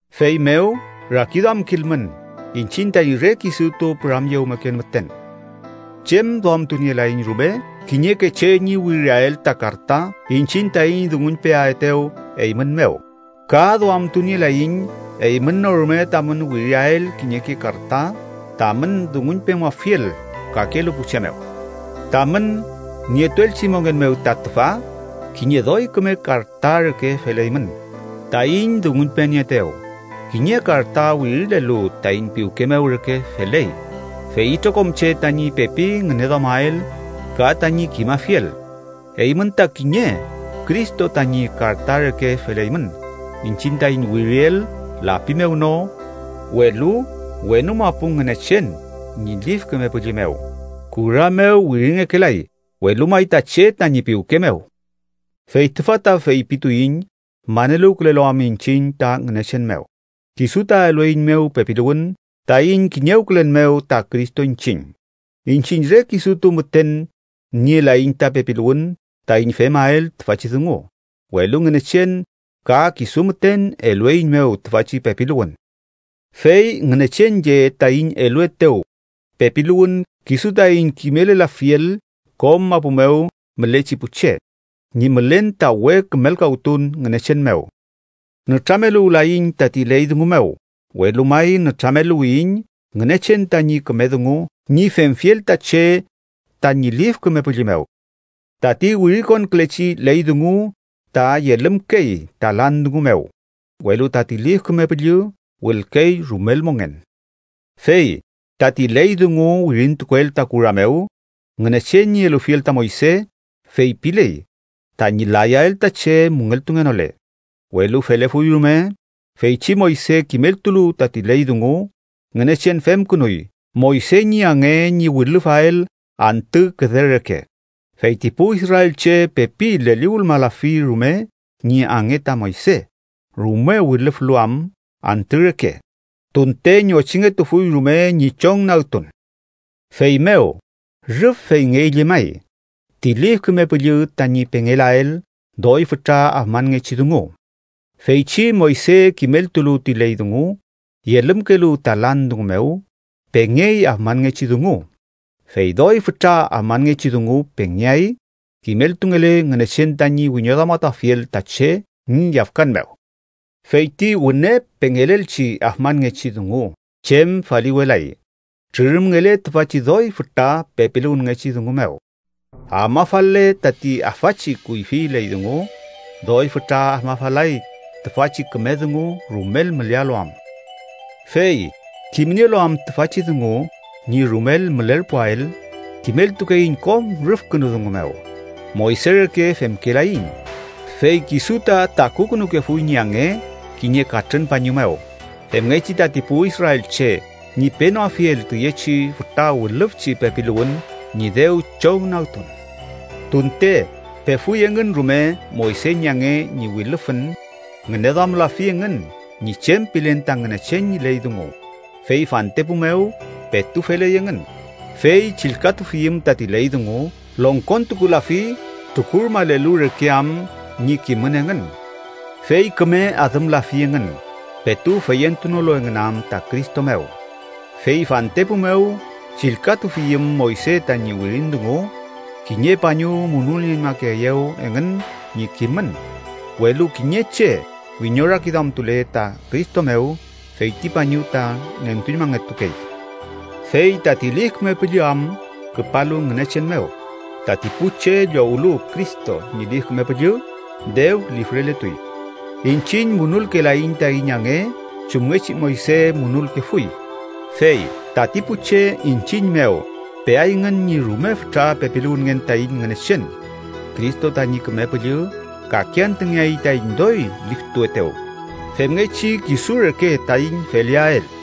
Feymew rakiduamkilmün iñchiñ taiñ re kisutu püramyewmeken müten. Chem duamtunielaiñ rume kiñeke che ñi wiriael ta karta iñchiñ taiñ dunguñpeaetew eymün mew. Ka duamtunielaiñ eymün no rume tamün wiriael kiñeke karta tamün dunguñpemuafiel kakelu pu che mew. Tamün nietuelchi mongen mew ta tüfa kiñe doy küme karta reke feleymün taiñ dunguñpenieetew, kiñe karta wirilelu taiñ piwke mew reke feley, fey itrokom che tañi pepi ngüneduamael ka tañi kimafiel. Eymün ta kiñe Cristo tañi karta reke feleymün iñchiñ taiñ wiriel lapi mew no, welu wenu mapu Ngünechen ñi Lif Küme Püllü mew. Kura mew wiringekelay, welu may ta che tañi piwke mew. Fey tüfa ta feypituiñ maneluwkülelu am iñchiñ ta Ngünechen mew, kisu ta elueiñmew pepiluwün taiñ kiñewkülen mew ta Cristo iñchiñ. Iñchiñ re kisutu müten nielaiñ ta pepiluwün taiñ femael tüfachi dungu, welu Ngünechen ka kisu müten elueiñmew tüfachi pepiluwün. Fey Ngünechen lle taiñ eluetew pepiluwün kisu taiñ kimelelafiel kom mapu mew mülechi pu che ñi mülen ta we kümelkawtun Ngünechen mew. Nütrameluwlayiñ tati ley dungu mew, welu may nütrameluwiyiñ Ngünechen tañi küme dungu ñi femfiel ta che tañi Lif Küme Püllü mew. Tati wirikonkülechi ley dungu ta yelümkey ta lan dungu mew, welu tati Lif Küme Püllü wülkey rumel mongen. Fey tati ley dungu wirintukuel ta kura mew, Ngünechen ñi elufiel ta Moyse, feypiley tañi layael ta che müngeltungenole. Welu felefuy rume, feychi Moyse kimeltulu tati ley dungu, Ngünechen femkünuy Moyse ñi ange ñi wilüfael antü küde reke, fey ti pu israelche pepi leliwülmalafi rume ñi ange ta Moyse rume wilüflu am antü reke, tunte ñochingetufuy rume ñi chongnagtun. ¡Feymew rüf feyngey llemay ti Lif Küme Püllü tañi pengelael doy fütra afmanngechi dungu! Feychi Moyse kimeltulu ti ley dungu yelümkelu ta lan dungu mew, pengey afmanngechi dungu, fey doy fütra afmanngechi dungu pengeay kimeltungele Ngünechen tañi wiñoduamatuafiel ta che ñi yafkan mew. Fey ti wüne pengelelchi afmanngechi dungu chem faliwelay, trürümngele tüfachi doy fütra pepiluwünngechi dungu mew. Afmafal-le tati afachi kuyfi ley dungu, doy fütra afmafalay tüfachi küme dungu rumel mülealu am. Fey kimnielu am tüfachi dungu ñi rumel mülerpuael, kimeltukeiñ kom rüfkünu dungu mew. Moyse reke femkelaiñ, fey kisu ta takukünukefuy ñi ange kiñe katrün pañu mew, femngechi tati pu israelche ñi penoafiel tüyechi fütra wilüfüchi pepiluwün ñi dew chongnagtun. Tunte pefuy engün rume Moyse ñi ange ñi wilüfün, ngüneduamlafi engün ñi chem pilen ta Ngünechen ñi ley dungu. Fey fantepu mew petu feley engün, fey chillkatufiyüm tati ley dungu, longkontukulafi trukurmalelu reke am ñi kimün engün. Fey küme adümlafi engün, petu feyentunolu engün am ta Cristo mew. Fey fantepu mew, chillkatufiyüm Moyse tañi wirin dungu, kiñe pañu munulnieñmakeeyew engün ñi kimün. Welu kiñe che wiñorakiduamtule ta Cristo mew, fey ti pañu ta nentuñmangetukey. Fey tati Lif Küme Püllü am küpalu Ngünechen mew, tati pu che llowlu Cristo ñi Lif Küme Püllü, dew lifreletuy. Iñchiñ munulkelaiñ taiñ ange chumngechi Moyse munulkefuy, fey tati pu che iñchiñ mew peayngün ñi rume fütra pepiluwünngen taiñ Ngünechen. Cristo tañi Küme Püllü kake antüngeay taiñ doy liftuetew femngechi kisu reke taiñ feleael.